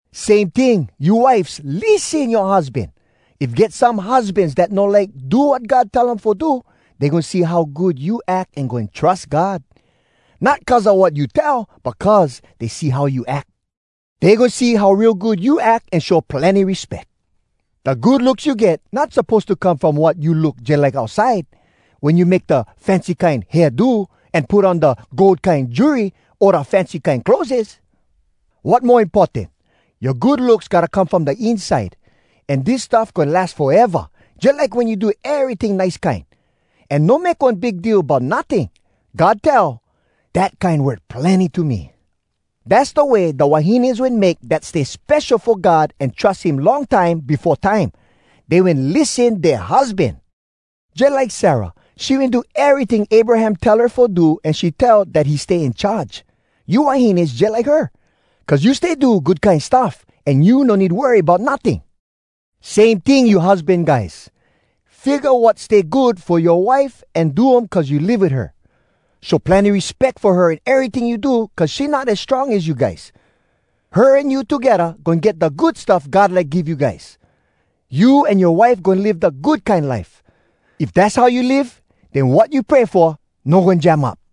Same ting, you wifes lissen yoa husban. If get some husbans dat no like do wat God tell um fo do, dey goin see how good you ack an goin trus God, not cuz a wat you tell, but cuz dey see how you ack. Dey goin see how real good you ack an show plenny respeck. Da good looks you get not suppose to come from wat you look jalike outside, wen you make da fancy kine hairdo, an put on da gold kine jewelry o da fancy kine clotheses. Wat mo importan, yoa good looks gotta come from da inside, an dis stuff goin las foeva, jalike wen you do eryting nice kine, an no make one big deal about notting. God tell, “Dat kine worth plenny to me.” Dass da way da wahines wen make dat stay spesho fo God an trus him long time befo time. Dey wen lissen dea husban. Jalike Sarah, she wen do eryting Abraham tell her fo do an she tell dat he stay in charge. You wahines jalike her, cuz you stay do good kine stuff, an you no need worry bout notting. Same ting you husban guys, figga wat stay good fo yoa wife an do um cuz you live wit her. Show plenny respeck fo her in eryting you do cuz she not as strong as you guys. Her an you togedda goin get da good stuff God like give you guys: you an yoa wife goin live da good kine life. If dass how you live, den wat you pray fo no goin jam up.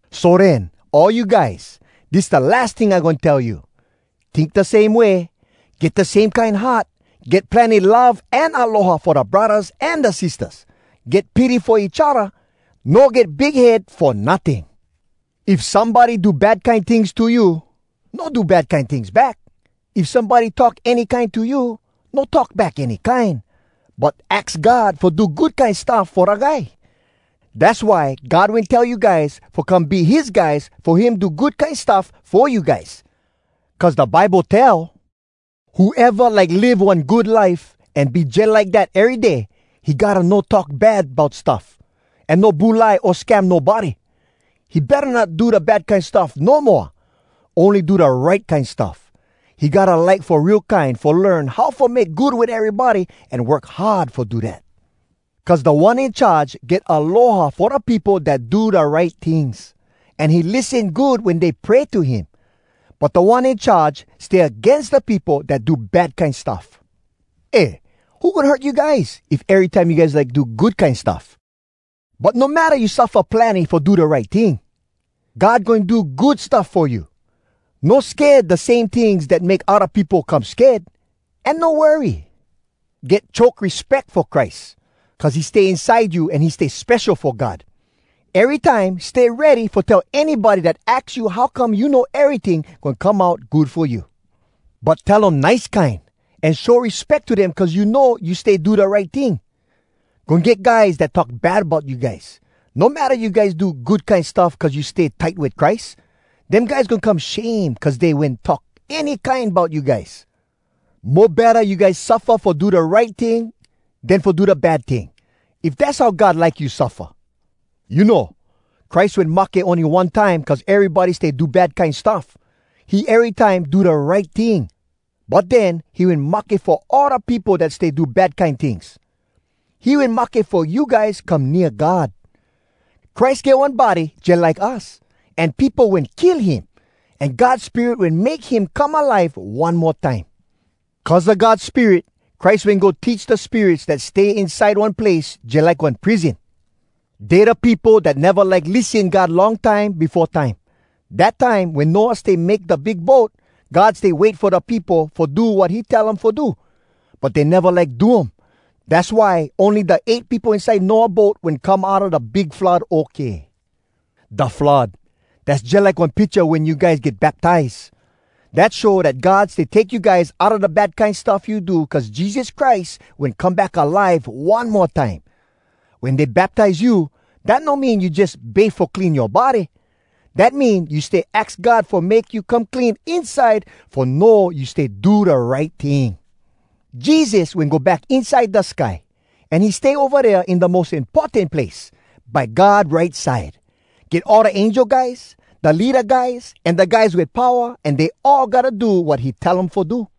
So den, all you guys, dis da las ting I goin tell you. Tink da same way. Get da same kine heart. Get plenny love an aloha fo da braddahs an da sistahs. Get pity fo each odda. No get big head fo notting. If somebody do bad kine tings to you, no do bad kine tings back. If somebody talk any kine to you, no talk back any kine. But aks God fo do good kine stuff fo da guy. Dass why God wen tell you guys fo come be his guys fo him do good kine stuff fo you guys. Cuz da Bible tell, “Whoeva like live one good life, An be jalike dat ery day, He gotta no talk bad bout stuff, An no bulai o scam nobody, He betta not do da bad kine stuff no moa, Ony do da right kine stuff. He gotta like fo real kine Fo learn how fo make good wit erybody, An work hard fo do dat. Cuz Da One In Charge get aloha fo da peopo Dat do da right tings, An he lissen good wen dey pray to him, But Da One In Charge stay agains Da peopo dat do bad kine stuff.” Eh, who goin hurt you guys if erytime you guys like do good kine stuff? But no matta you suffa plenny fo da right ting, God goin do good stuff fo you. No sked da same tings dat make odda peopo come sked, an no worry. Get choke respeck fo Christ cuz he stay inside you an he stay spesho fo God. Erytime stay ready fo tell anybody dat aks you how come you know eryting goin come out good fo you. But tell um nice kine, an show respeck to dem cuz you know you stay do da right ting. Goin get guys dat talk bad bout you guys, no matta you guys do good kine stuff cuz you stay tight wit Christ. Dem guys goin come shame cuz dey wen talk any kine bout you guys. Mo betta you guys suffa fo do da right ting den fo do da bad ting, if dass how God like you suffa. You know, Christ wen mahke ony one time cuz erybody stay do bad kine stuff. He erytime do da right ting, but den he wen mahke fo all da peopo dat stay do bad kine tings. He wen mahke fo you guys come nea God. Christ get one body jalike us, an peopo wen kill him, an God Spirit wen make him come alive one mo time. Cuz a God Spirit, Christ wen go teach da spirits dat stay inside one place jalike one prison. Dey da peopo dat neva like lissen God long time befo time. Dat time, wen Noah stay make da big boat, God stay wait fo da peopo fo do wat he tell um fo do, but dey neva like do um. Dass why ony da eight peopo inside Noah boat wen come outa da big flood okay. Da flood, dass jalike one picha wen you guys get baptize. Dat show dat God stay take you guys outa da bad kine stuff you do cuz Jesus Christ wen come back alive one mo time. Wen dey baptize you, dat no mean you jus bafe fo clean yoa body. Dat mean you stay aks God fo make you come clean inside fo know you stay do da right ting. Jesus wen go back inside da sky, an he stay ova dea in da mos importan place, by God right side. Get all da angel guys, da leada guys, an da guys wit powa, an dey all gotta do wat he tell um fo do.